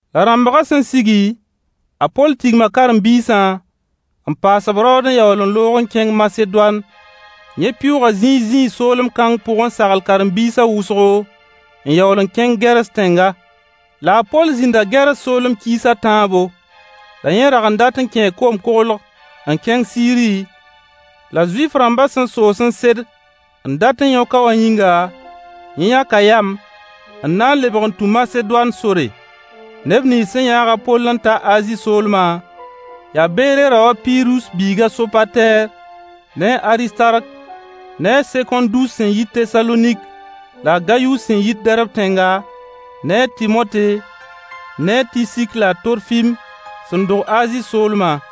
La rãmbgã sẽn sigi, a Poll tigma karen-biisã n paas-b raood n yaool n loog n kẽng Masedoan. Yẽ pɩʋʋga zĩig zĩig soolem kãng pʋg n sagl karen-biisã wʋsgo, n yaool n kẽng Gɛrs tẽnga. La a Poll zĩnda Gɛrs soolem kiis a tãabo. La yẽ rag n dat n kẽe koom-koglg n kẽng Siiri, la Zuif-rãmbã sẽn soos n sed n dat yõk-a wã yĩnga, yẽ yãka yam n na n lebg n tũ Masedoan sore. Neb nins sẽn yãag a Poll n ta Azi soolma, yaa Beere rao a Pirus biiga a Sopatɛɛr ne a Aristark ne a Sekõndus sẽn yit Tesalonik la a Gayus sẽn yit Dɛrb tẽnga, ne a Tɩmote ne a Tisik la a Torfim sẽn dog Azi soolma.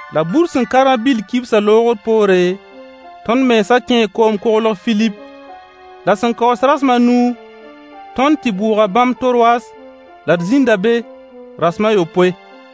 La bur sẽn ka rã-bɩll kibsã loogr poore, tõnd mensã kẽe koom-koglg Filip. La sẽn kaoos rasem a nu, tõnd tɩ bʋʋga bãmb Torwas, la d zĩnda be rasem a yopoe.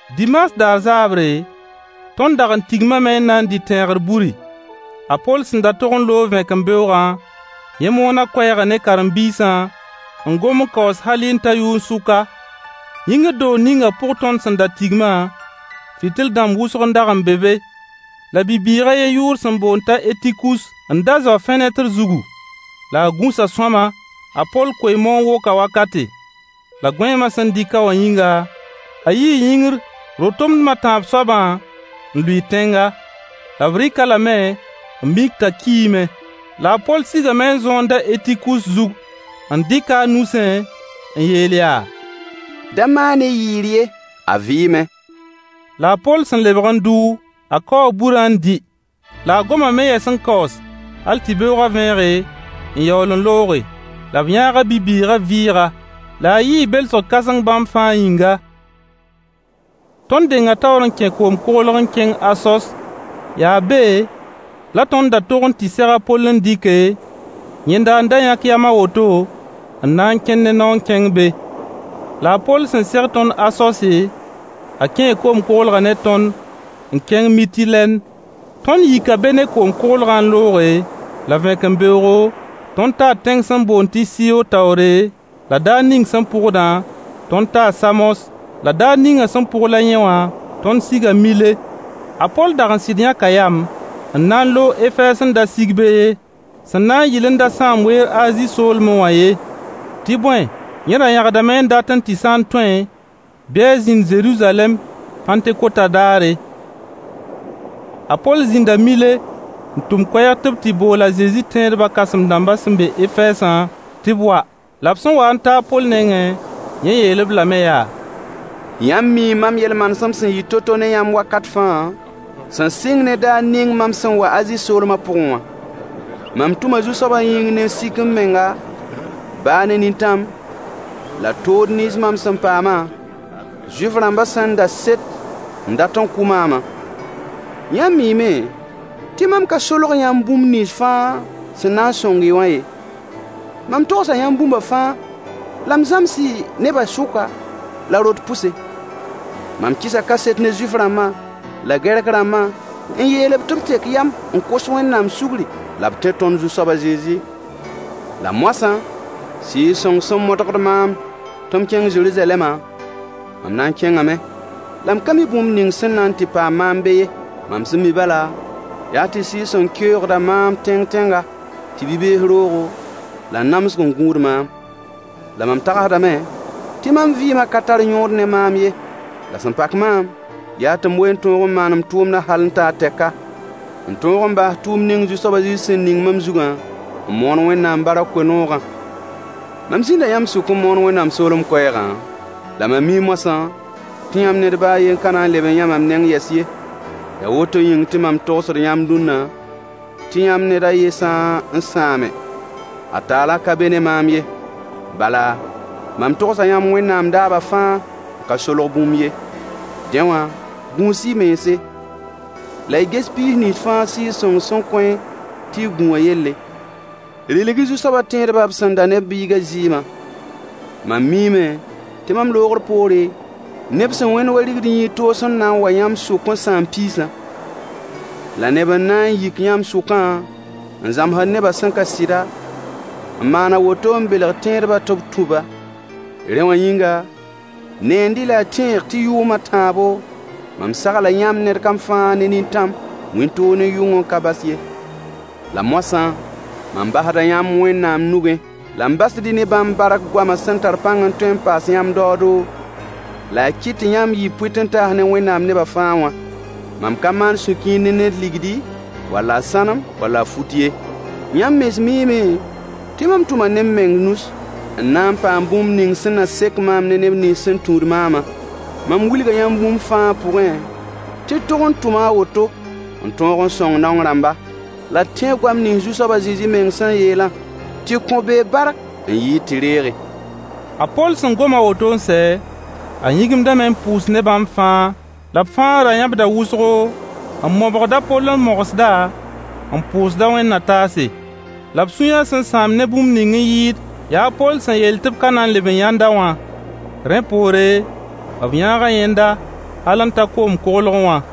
Dimaas daar zaabre, tõnd dag n tigmame n na dɩ tẽegr buri. A Poll sẽn da tog n loog vẽkembeoogã, yẽ moona koɛɛgã ne karen-biisã n gom n kaoos halɩ n ta yʋn-sʋka. Yĩngr doog ninga pʋg tõnd sẽn da tigma, fɩtl-dãmb wʋsg n dag n be be. La bi-bɩɩg a yen yʋʋr sẽn boond t'a Etikus n da zao fẽnetr zugu. La a gũsa sõama, a Poll koe-moon-wokã wakate. La gõeemã sẽn dɩk-a wã yĩnga, a yii yĩngr ro-tomdem a tãab soabã n lʋɩ tẽnga. La b rɩk-a lame n mik t'a kiime. La a Poll sigame n zõond a Etikus zug n dɩk-a a nusẽ n yeel yaa: Da maan-y yɩɩr ye, a vɩɩme. La a Poll sẽn lebg n dʋ, a Kao burã n dɩ. La a gomame yɛs n kaoos hal tɩ beoogã vẽege, n yaool n looge. La b yãaga bi-bɩɩgã vɩɩga. La a yɩɩ belsg kãseng bãmb fãa yĩnga. Tõnd denga taoor n kẽ koom-koglg n kẽng Asos, yaa be la tõnd da tog n tɩ seg a Poll n dɩke, yẽnda n da yãk yam a woto n na n kẽn ne nao n kẽng be. La a Poll sẽn seg tõnd Asose, a kẽe koom-koglgã ne tõnd n kẽng Mitilɛn. Tõnd yika be ne koom-koglgã n looge, la vẽkembeoogo, tõnd taa tẽng sẽn boond tɩ Siyo taoore, la daar ning sẽn pʋgdã, tõnd taa Samos, la daar ninga sẽn pʋgla yẽ wã, tõnd siga Mile. A Poll dag n sɩd yãka yam n na n loog Efɛɛs n da sig be ye, sẽn na n yɩl n da sãam weer Azi soolme wã ye. Tɩ bõe, yẽ ra yãgdame n datẽ tɩ sã n tõe, bɩ a zĩnd Zeruzalɛm Pãntekotã daare. A Poll zĩnda Mile n tʋm koɛɛg tɩ b bool a Zezi tẽedbã kãsem-dãmbã sẽn be Efɛɛsã tɩ b wa. La b sẽn wa n ta a Poll nengẽ, yẽ yeel-b lame yaa: Yãmb mii mam yel-manesem sẽn yɩ to-to ne yãmb wakat fãa, sẽn sɩng ne daar ning mam sẽn wa Azi soolmã pʋgẽ wã. Mam tʋma Zu-soab yĩng ne sik-m-menga, baa ne nintãmã, la tood nins mam sẽn paamã, Zuif-rãmbã sẽn da set n dat n kʋ maamã. Yãmb miime tɩ mam ka solg yãmb bũmb nins fãa sẽn na n sõng-y wã ye. Mam togsa yãmb bũmba fãa la m zãms-y nebã sʋka la rot pʋse. Mam kɩsa kaset ne Zuif-rãmba la Gɛrk-rãmbã n yeel-b tɩ b tek yam n kos Wẽnnaam sugri, la b tẽ tõnd Zu-soab a Zezi. La moasã, Sɩɩg-sõng sẽn modgd maam tɩ m kẽng Zeruzalɛmã, mam na n kẽngame, la m ka mi bũmb ning sẽn na n tɩ paam maam be ye. Mam sẽn mi bala, yaa tɩ Sɩɩg-sõng keoogda maam tẽng tẽnga, tɩ bi-bees roogo la namsg n gũud maam. La mam tagsdame tɩ mam vɩɩmã ka tar yõod ne maam ye. La sẽn pak maam yaa tɩ m wee n tõog n maan m tʋʋmdã hal n ta a tɛka, n tõog n baas tʋʋmd ning Zu-soab a Zezi sẽn ning mam zugã, n moon Wẽnnaam barkã koe-noogã. Mam zĩnda yãmb sʋk n moon Wẽnnaam soolem koɛɛgã, la mam mii moasã tɩ yãmb ned baa a yen ka na n le yã mam neng yɛs ye. Yaa woto yĩng tɩ mam togsd yãmb dũnna, tɩ yãmb ned a yen sã n sãame, a taalã ka be ne maam ye. Bala, mam togsa yãmb Wẽnnaam daabã fãa n ka solg bũmb ye. Dẽ wã, gũus-y mense, la y ges piis nins fãa Sɩɩg-sõng sẽn kõ-y tɩ y gũ wã yelle. Rɩlg-y Zu-soabã tẽedbã b sẽn da ne b biigã zɩɩmã. Mam miime tɩ mam loogr poore, neb sẽn wẽnd wa rigd-n-yĩid toos n na n wa yãmb sʋk n sãam piisã. La neb n na n yik yãmb sʋkã n zãmsd nebã sẽn ka sɩda, n maan a woto n belg tẽedba tɩ b tũ-ba. Rẽ wã yĩnga, neend-y la y tẽeg tɩ yʋʋm a tãabo, mam sagla yãmb ned kam fãa ne nintãm, wĩntoog ne yʋng n ka bas ye. La moasã, mam basda yãmb Wẽnnaam nugẽ, la m basd-y ne bãmb bark goamã sẽn tar pãng n tõe n paas yãmb daoodo, la a kɩt tɩ yãmb yɩ pʋɩt-n-taas ne Wẽnnaam neba fãa wã. Mam ka maan sũ-kiir ne ned ligdi, wall a sãnem, wall a fut ye. Yãmb mens miime tɩ mam tʋma ne m meng nus n na n paam bũmb ning sẽn na sek maam ne neb nins sẽn tũud maamã. Mam wilga yãmb bũmb fãa pʋgẽ tɩ d tog n tʋma a woto n tõog n sõng naong rãmba, la d tẽeg goam nins Zu-soab a Zezi meng sẽn yeelã: Tɩ kõ bee bark n yɩɩd tɩ reege. A Poll sẽn gom a woto n sɛ, a yĩgimdame n pʋʋs ne bãmb fãa. La b fãa ra yãbda wʋsgo, n mobgd a Poll n mogsd-a, n pʋʋsd-a wẽnd-na-taase. La b sũyã sẽn sãam ne bũmb ning n yɩɩd yaa a Poll sẽn yeel tɩ b ka na n leb n yãnd-a wã. Rẽ poore, b yãaga yẽnda hal n ta koom-koglgẽ wã.